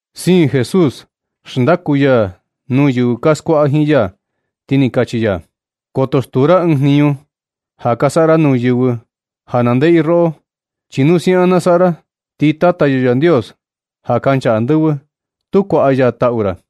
Siin Jesús xndaku ya nuu yɨvɨ ka skuaꞌa jiin ya, ti ni kachi ya: ―Koto stuu ra ɨɨn jniñu ja ka saꞌa ra nuu yɨvɨ ja na ndeꞌe i roꞌo. Chi nu siaꞌan na saꞌa ra, ti Tata yo Yandios ja kancha andɨvɨ, tu kuaꞌa ya taꞌu ra.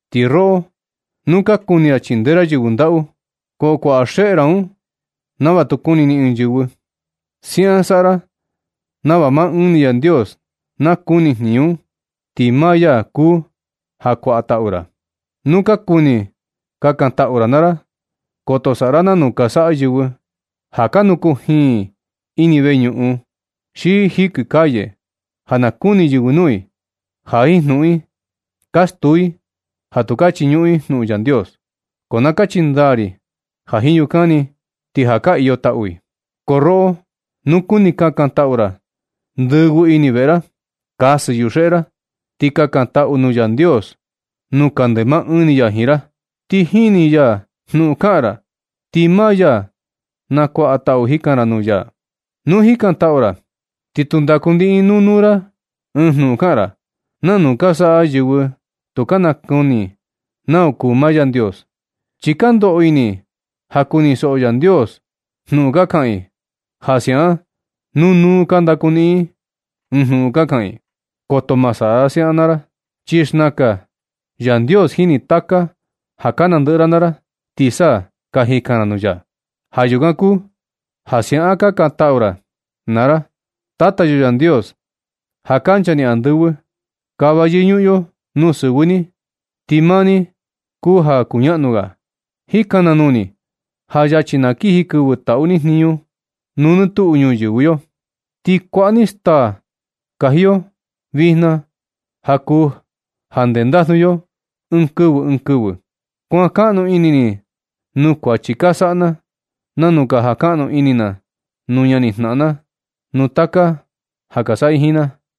Ti roꞌo nu ka kuni ra chindee ra yɨvɨ ndaꞌu, ko kuaꞌa xeꞌe ra un nava tu kuni ni ɨɨn yɨvɨ. Siaꞌan saꞌa ra nava maa ɨɨn ni Yandios na kuni jniñu un, chi maa ya kuu ja kuaꞌa taꞌu ra. Nu ka kuni kakantaꞌu ra naa ra, koto saꞌa ra nanu ka saꞌa yɨvɨ ja ka nu kujiin i ini veñuꞌun, xi jikɨ calle ja na kuni yɨvɨ nuu i, ja jiin jnuꞌun i ka stuu i ja tu ka chiñuꞌun i jnuꞌun Yandios. Ko na kachi ndaa ri ja jiin yukan ni, ti ja ka iyo taꞌu i. Ko roꞌo nu kuni kakantaꞌu ra, ndɨvɨ ini veꞌe ra, kasɨ yuxeꞌe ra, ti kakantaꞌu nuu Yandios nuu kande maa ɨɨn ni ya jiin ra. Ti jini ya jnuꞌun kaꞌan ra, ti maa ya na kuaꞌa taꞌu jikan ra nuu ya. Nu jikantaꞌu ra, ti tu ndaku niꞌin nuu nuu ra ɨɨn jnuꞌun kaꞌan ra, nanu ka saꞌa yɨvɨ tu ka nakuni nau kuu maa Yandios. Chi ka ndoꞌo ini i ja kunisoꞌo Yandios jnuꞌun ka kaꞌan i, ja siaꞌan nu nuu nuu ka ndaku niꞌin i jnuꞌun ka kaꞌan i. Koto ma saꞌa ra siaꞌan naa ra, chi xnaka Yandios jini taka ja ka nandɨꞌɨ ra naa ra, ti sa ka jikan ra nuu ya. Ja yukan kuu ja siaꞌan kakantaꞌu ra naa ra: Tata yo Yandios, ja kancha ni andɨvɨ, kava yɨñuꞌun yo nuu sɨvɨ ni, ti maa ni kuu ja kuñaꞌnu ga. Jika na nuu ni ja yachi na kiji kɨvɨ taꞌu ni jniñu nuu nɨ tuꞌu ñuyɨvɨ yo. Ti kuaꞌa ni staa nakaji yo vijna ja kuu ja ndendajnu yo ɨɨn kɨvɨ ɨɨn kɨvɨ. Kuan kaꞌnu ini ni nuu kuachi ka saꞌa na, nanu ka jan kaꞌnu ini na nuu ñanijnaꞌan na nuu taka ja ka saꞌa i jiin na.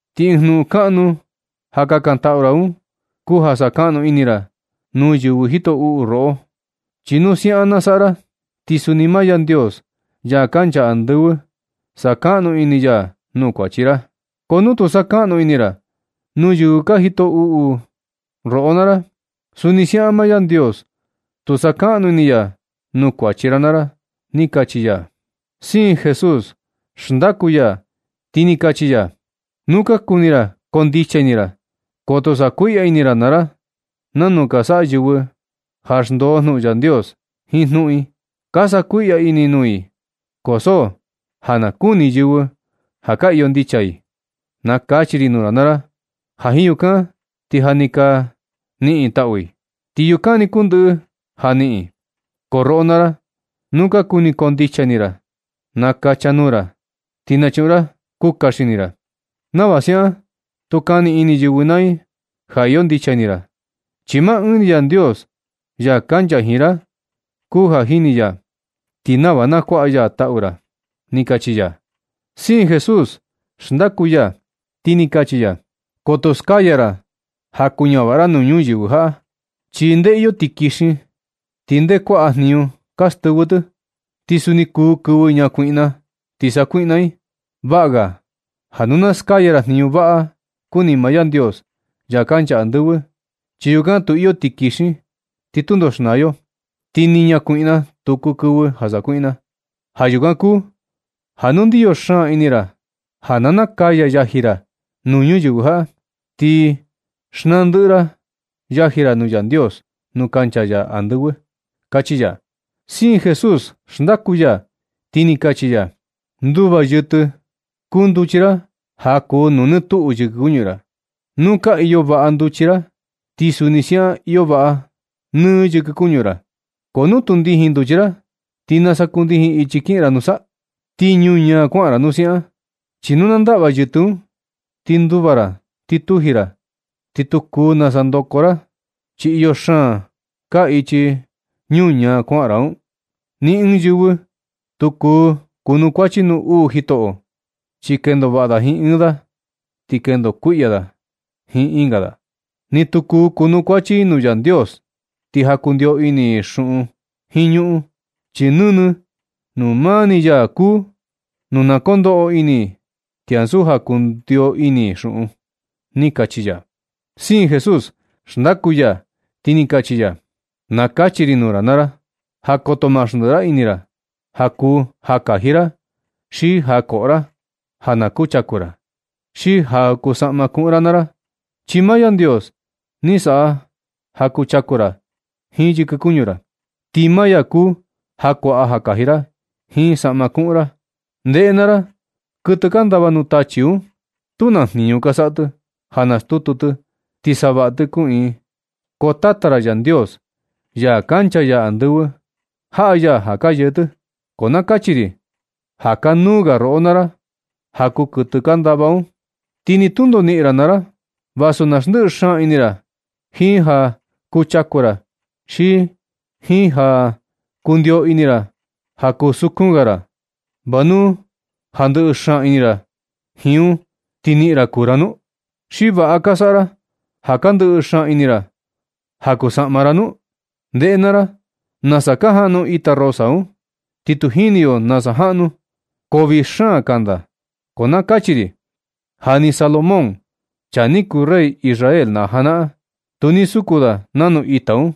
Ti ɨɨn jnuꞌun kanuu ja kakantaꞌu ra un kuu ja sakaꞌnu ini ra nuu yɨvɨ jito uꞌu roꞌo. Chi nu siaꞌan na saꞌa ra, ti suni maa Yandios, ya kancha andɨvɨ, sakaꞌnu ini ya nuu kuachi ra. Ko nu tu sakaꞌnu ini ra nuu yɨvɨ ka jito uꞌu roꞌo naa ra, suni siaꞌan maa Yandios tu sakaꞌnu ini ya nuu kuachi ra naa ra ―ni kachi ya. Siin Jesús xndaku ya ti ni kachi ya: ―Nu ka kuni ra koo ndicha ini ra, koto sakuiꞌya ini ra naa ra nanu ka saꞌa yɨvɨ ja xndoo jnuꞌun Yandios jiin jnuꞌun i. Ka sakuiꞌya i nuu i ko so ja na kuni yɨvɨ ja ka iyo ndicha i. Na kachi ri nuu ra ja jiin yukan, ti ja ni ka niꞌin taꞌu i. Ti yukan ni kuu ndɨꞌɨ ja niꞌin i. Ko roꞌo naa ra, nu ka kuni koo ndicha ini ra, nakacha nuu ra, ti nachuꞌun ra kuka xini ra. Nava siaꞌan tu kani ini yɨvɨ naa i ja iyo ndicha ini ra, chi maa ɨɨn ni Yandios, ya kancha jiin ra kuu ja jini ya, ti nava na kuaꞌa ya taꞌu ra ―ni kachi ya. Siin Jesús xndaku ya, ti ni kachi ya: ―Koto skaya ra ja kuñavaꞌa ra nuu ñuyɨvɨ jaꞌa, chi nde iyo tikixin ti nde kuaꞌa jniñu ka stɨvɨ tɨ, ti suni kuu kɨvɨ ñakuiꞌna ti sakuiꞌna i. Vaꞌa ga ja nu na skaya ra jniñu vaꞌa kuni maa Yandios, ya kancha andɨvɨ, chi yukan tu iyo tikixin ti tundo xnaa yo, ti ni ñakuiꞌna tu kuu kɨvɨ ja sakuiꞌna. Ja yukan kuu ja nu ndiyo xaan ini ra ja na nakaya yaji ra nuu ñuyɨvɨ jaꞌa, ti xnaa ndɨꞌɨ ra yaji ra nuu Yandios nuu kancha ya andɨvɨ ―kachi ya. Siin Jesús xndaku ya ti ni kachi ya: ―Nduva yɨtɨ kuu nduchi ra ja kuu nuu nɨ tuꞌu yɨkɨ kuñu ra. Nu ka iyo vaꞌa nduchi ra, ti suni siaꞌan iyo vaꞌa nɨ yɨkɨ kuñu ra. Ko nu tu ndijin nduchi ra, ¿ti nasa kundijin ichi kiꞌin ra nusa? Ti ñuñaa kuaꞌan ra nu siaꞌan. Chi nu na ndaꞌva yɨtɨ un, ti nduva ra ti tuji ra. Ti tu kuu nasa ndoko ra, chi iyo xaan kaa ichi ñuñaa kuaꞌan ra un. Ni ɨɨn yɨvɨ tu kuu kunukuachi nuu uu jitoꞌo, chi kendo vaꞌa i jiin ɨɨn da, ti kendo kuiꞌya i jiin ɨnga da. Ni tu kuu kunukuachi i nuu Yandios, ti ja kundio ini i xuꞌun jiin ñuꞌun. Chi nɨnɨ nuu maa ni ya kuu nu na kondoꞌo ini i, ti ansu ja kundio ini i xuꞌun ―ni kachi ya. Siin Jesús xndaku ya, ti ni kachi ya: ―Na kachi ri nuu ra naa ra, ja koto ma xndiꞌi ra ini ra ja kuu ja kaji ra xi ja koꞌo ra, ja na kuchaku ra, xi ja kuu saꞌma kuꞌun ra naa ra. Chi maa Yandios ni saꞌa ja chaku ra jiin yɨkɨ kuñu ra. Ti maa ya kuu ja kuaꞌa ja kaji ra jiin saꞌma kuꞌun ra. Ndeꞌe naa ra, kɨtɨ ka ndava nuu tachi un, tu naa jniñu ka saꞌa tɨ ja nastutu tɨ, ti savaꞌa tɨ kuꞌiin, ko Tata ra Yandios, ya kancha ya andɨvɨ, jaꞌa ya ja ka yee tɨ. Ko na kachi ri ja kanuu ga roꞌo naa ra ja kuu kɨtɨ ka ndava un. Ti ni tundo niꞌin ra naa ra vasu na xndiꞌi xaan ini ra jiin ja kuchaku ra, xi jiin ja kundio ini ra ja kusukun ga ra. ¿Va nu ja ndɨꞌɨ xaan ini ra jiin un, ti niꞌin ra kuu ra nu? ¿Xi vaꞌa ka saꞌa ra ja ka xndiꞌi xaan ini ra ja kuu saꞌma ra nu? Ndeꞌe naa ra nasa ka jaꞌnu ita rosa un, ti tu jini yo nasa jaꞌnu, ko vii xaan kanda. Ko na kachi ri ja ni Salomón, chaa ni kuu rey Israel na janaꞌan, tu ni suku da nanu ita un,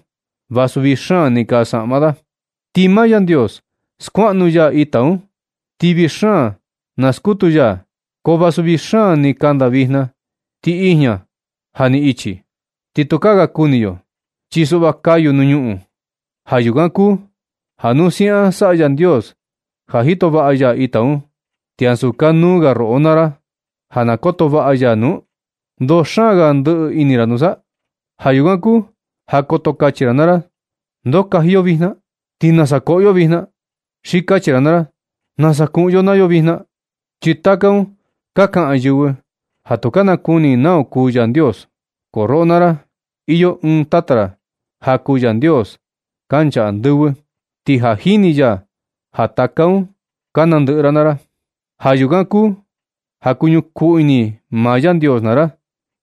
vasu vii xaan ni kaa saꞌma da. Ti maa Yandios skuaꞌnu ya ita un, ti vii xaan na skutu ya i. Ko vasu vii xaan ni kanda vijna ti ijña ja ni ka ichi, ti tukaa ga kuni yo. Chi suꞌva kayu nuu ñuꞌun. Ja yukan kuu ja nu siaꞌan saꞌa Yandios ja jito vaꞌa ya ita un, ¿ti ansu kanuu ga roꞌo naa ra ja na koto vaꞌa ya nu? ¿Ndoo xaan ka ndɨꞌɨ ini ra nusa? Ja yukan kuu ja koto kachi ra naa ra: “¿Ndoo kaji yo vijna? ¿Ti nasa koꞌo yo vijna?” Xi kachi ra naa ra: “¿Nasa kuꞌun yo naa yo vijna?” Chi taka un ka kaꞌan yɨvɨ, ja tu ka nakuni i nau kuu Yandios. Ko roꞌo naa ra, iyo ɨɨn Tata ra ja kuu Yandios kancha andɨvɨ, ti ja jini ya ja taka un ka nandɨꞌɨ ra naa ra. Ja yukan kuu ja kuñukuu ini maa Yandios naa ra,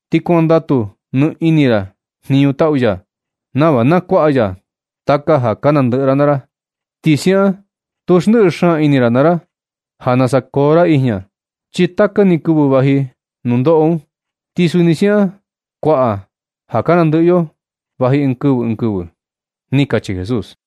ti kuandatu nɨ ini ra jniñu taꞌu ya, nava na kuaꞌa ya taka ja ka nandɨꞌɨ ra naa ra. Ti siaꞌan tu xndiꞌi xaan ini ra naa ra ja nasa koo ra ijña, chi taka ni kɨvɨ vaji nundoꞌo un, ti suni siaꞌan kuaꞌa ja ka nandɨꞌɨ yo vaji ɨɨn kɨvɨ ɨɨn kɨvɨ ―ni kachi Jesús.